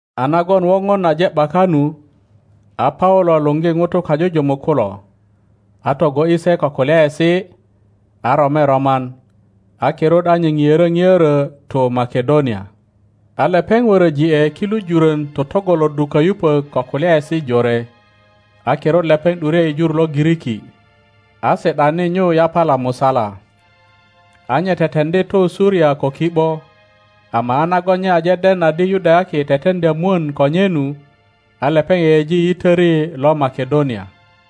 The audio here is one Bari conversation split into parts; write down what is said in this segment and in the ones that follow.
A nagon woŋon aje ’baka nu, a Paulo luŋgi ŋutu kajujumuk kulo, a togo ’yi se ko kulyaesi, a rome roman, a kirut a nye ŋiörö ŋiörö tu Makedonia. A lepeŋ wöröji ’e kilu jurön totŋgoloddu kayupök ko kulyaesi jore, a kirut lepeŋ ’dure i jur lo Giriki, a si ’dani nyu yapala musala. A nye teteŋdi tu Suria ko ki ’bo, ama a nagon nye aje den adi Yudayaki teteŋdya mwön ko nye nu, a lepeŋ yeyeji yitöri lo Makedonia.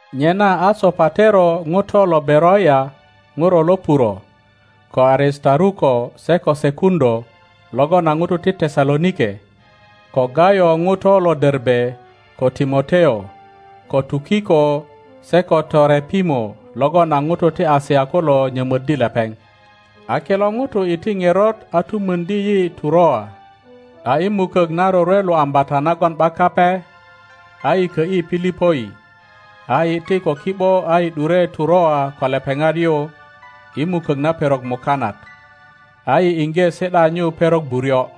Nyena a Sopatero ŋuto lo Beroia ŋuro lo Ŋuro, ko Aristaruko se ko Seku ŋilo logon a ŋutu ti Tesalonike; ko Gayo ŋuto lo Derbe, ko Timoteo, ko Tukiko se ko Torepimo logon a ŋutu ti Asia kulo nyömöddi lepeŋ. a kilo ŋutu iti ŋerot a tu möŋdi yi Turoa. A i mukök na rorwe lo Ambata nagon ’bak Kape, a yi kö ’yi Pilipoi, a iti ko ki ’bo a yi ’dure Turoa ko lepeŋat yu i mukök na perok mukanat, a yi iŋge si ’da nyu perok buryo.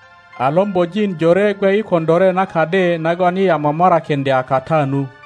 A lombojin jore gwe i koŋilore na kadi nagon yi a momorakiŋdye kata nu.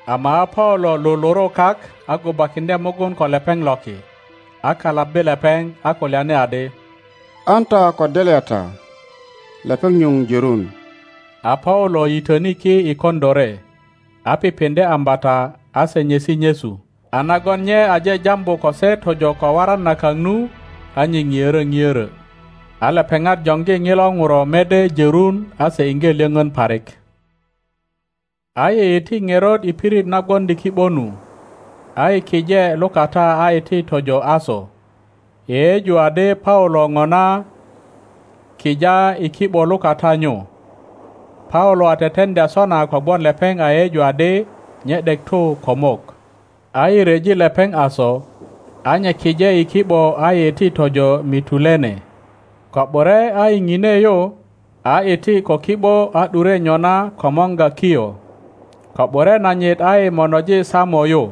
Ama a Paulo luluru kak a gubakiŋdye mugun ko lepeŋ loki, a kalabbi lepeŋ, a kulyani adi, An ta ko delya ta, lepeŋ nyuŋ jörun. A Paulo yitöni ki i koŋilore, a pipiŋdye ambata a se nyesi nyesu, a nagon nye aje jambu ko se tojo ko waran na kak nu, a nye ŋiörö ŋiörö. A lepeŋat joŋgi ŋilu ŋuro mede jörun a se iŋge lyöŋön parik. A yi iti ŋerot i pirit na gwoŋdi ki ’bo nu, a yi kije lukata a iti tojo Aso, yeyeju adi Paulo ŋona kija i ki ’bo lukata nyu. Paulo a teteŋdya sona kogwon lepeŋ a yeyeju adi nye ’dek tu ko mok. A yi ryeji lepeŋ Aso, a nye kije i ki ’bo a yi iti tojo Mitulene. Ko ’bure a yi ŋine yu, a iti ko ki ’bo a ’dure nyona komorga Kio, Ko ’bure nanyit a yi monoji Samo yu.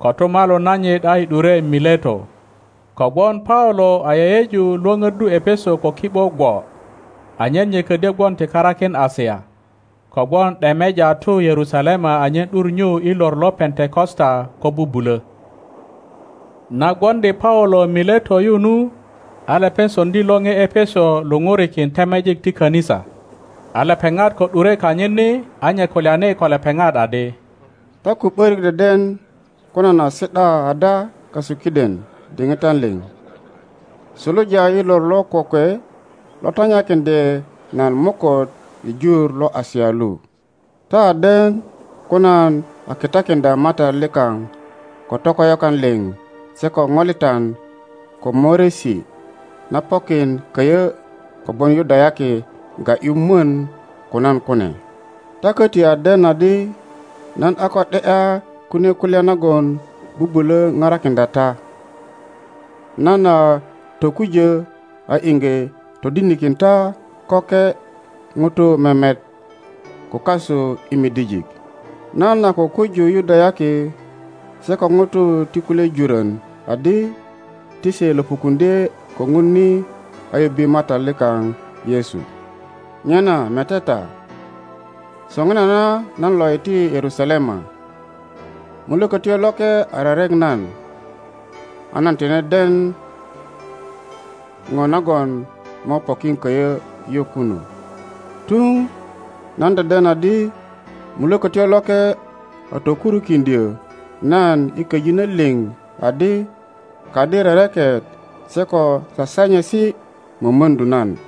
Kotumalu nanyit a yi ’dure Mileto. Kogwon Paulo a yeyeju lwöpöddu Epeso ko ki ’bo gwo, anyen nye ködyö gwon ti karakin Asia, kogwon ’demeja tu Yerusalema anyen ’dur nyu i lor lo Pentekosta ko bubulö. Na gwoŋdi Paulo Mileto yu nu, a lepeŋ soŋdi lore Epeso luŋurikin temejik ti kanisa, A lepeŋat ko ’dure kanyit ni, a nye kulyani ko lepeŋat adi, Ta ko ’börik deden ko nan a si ’da ada kasu kiden diŋitan liŋ, suluja i lor lo kokwe lo tanyakiŋdye nan moköt i jur lo Asia lu. Ta a den ko nan a kitakiŋdya Matat likaŋ ko tokoyokan liŋ se ko ŋolitan ko möriesi na pokin köyö kogwon Yudayaki ga ’yu mwön ko nan kune, Ta köti a den adi nan a ko ’de ’ya kunie kulya nagon bubulö parakiŋdya ta. Nan a tokujö a iŋge todinikin ta köke ŋutu memet, ko kasu i midijik. Nan a kukuju Yudayaki se ko ŋutu ti kulye jurön adi ti se löpukuŋdye ko Ŋun ni a yubbe Matat likaŋ Yesu. Nyena mete ta, soŋinana nan lo iti Yerusalema, Mulökötyo Loke a rerek nan, a nan tine den ŋo nagon mo pokin köyö yu kunu. Tuŋ nan deden adi Mulökötyo Loke a tokurukiŋdyö nan i köjinö liŋ adi kadi rereket se ko sasanyesi mömöŋdu nan.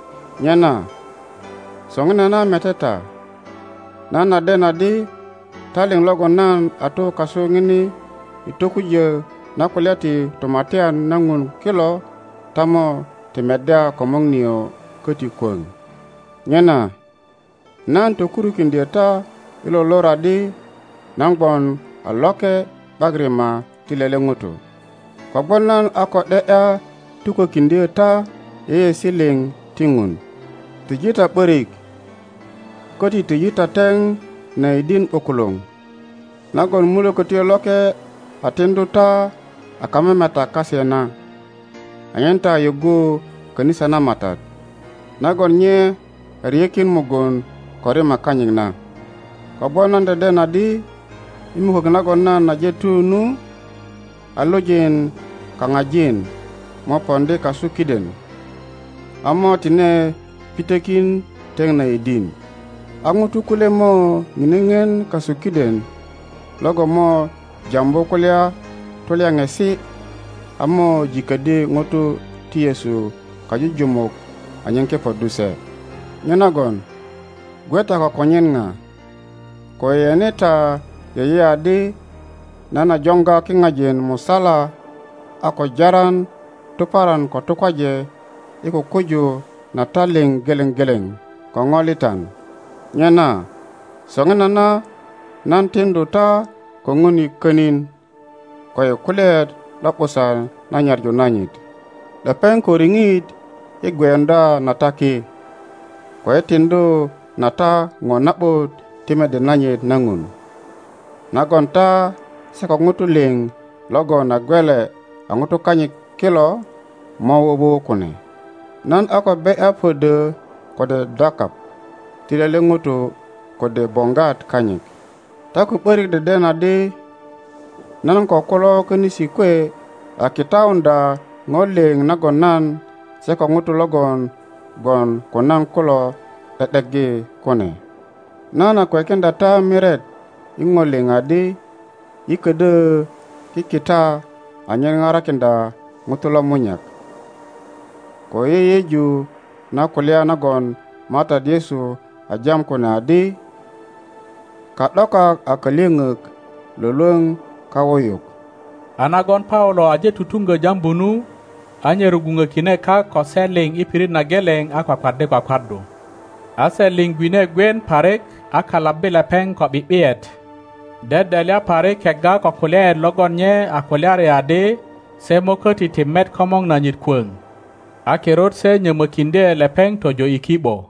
Nyena soŋinana mete ta, nan a den adi ta liŋ logon nan a tu kasu ŋini i tokujö na kulya ti Tumatyan na Ŋun kilo ta mo ti meddya komor nio köti kwöŋ. Nyena nan tokurukiŋdyö ta i lo lor adi nan gwon a loke ’bak rima ti lele ŋuto, kogwon nan a ko ’de ’ya tukökiŋdyö ta yeyeesi liŋ ti Ŋun. Tiji ta ’börik, köti tiji ta teŋ na yidin ’bukuluŋ nagon Mulökötyo Loke a tiŋdu ta a kamemetak kase na, anyen ta yuggu kanisa na Matat, nagon nye a ryekin mugun ko rima kanyit na. Kogwon nan deden adi i mukök nagon nan aje tu nu, a lujin kaŋajin mo poŋdi kasu kiden, a mo tine pitökin teŋ na yidin. a ŋutu kulye mo ŋine ŋien kasu kiden logon mo jambu kulya tulyaŋesi a mo jiköddi ŋutu ti Yesu kajujumuk anyen kepoddu se. Nyenagon gwe ta ko konyen ŋa, ko yeyene ta yeye adi nan a joŋga kiŋajin musala a ko jaran tuparan ko tukwaje i kukuju na ta liŋ geleŋ geleŋ ko ŋolitan. Nyena soŋinana nan tiŋdu ta ko Ŋun i könin ko i kulyaet lo ’busan na nyaŋu nanyit. Lepeŋ ko riŋit i gweyuŋdya na ta ki, ko i tiŋdu na ta ŋo na ’but ti mede nanyit na Ŋun, nagon ta se ko ŋutu liŋ logon a gelwe a ŋutu kanyit kilo mo wuwu kune. Nan a ko be ’ya pödö kode dakaŋ ti lele ŋuto kode boŋgwat kanyit. Ta ko ’börik deden adi nan ko kulo könisi kwe a kitauŋdya ŋo liŋ nagon nan se ko ŋutu logon gwon ko nan kulo ’de ’deggi kune. Nan a kwekiŋdya ta miret i ŋo liŋ adi yi ködyö kikita anyen parakiŋdya ŋutu lomunyak, ko i yeyeju na kulya nagon Matat Yesu a jam kune adi, Ka ’dokak a kalyöŋök lwölwöŋ kawuyuk. A nagon Paulo aje tutuŋgö jambu nu, a nye rugwuŋökine kak ko se liŋ i pirit na geleŋ a kwakwaddi kwakwaddu. A se liŋ gwine gwien parik, a kalabbi lepeŋ ko ’bi ’biyet, dedelya parik kegga ko kulyaet logon nye a kulyari adi se mo köti ti met komor nanyit kwöŋ. A kirut se nyömökindye lepeŋ tojo i ki ’bo.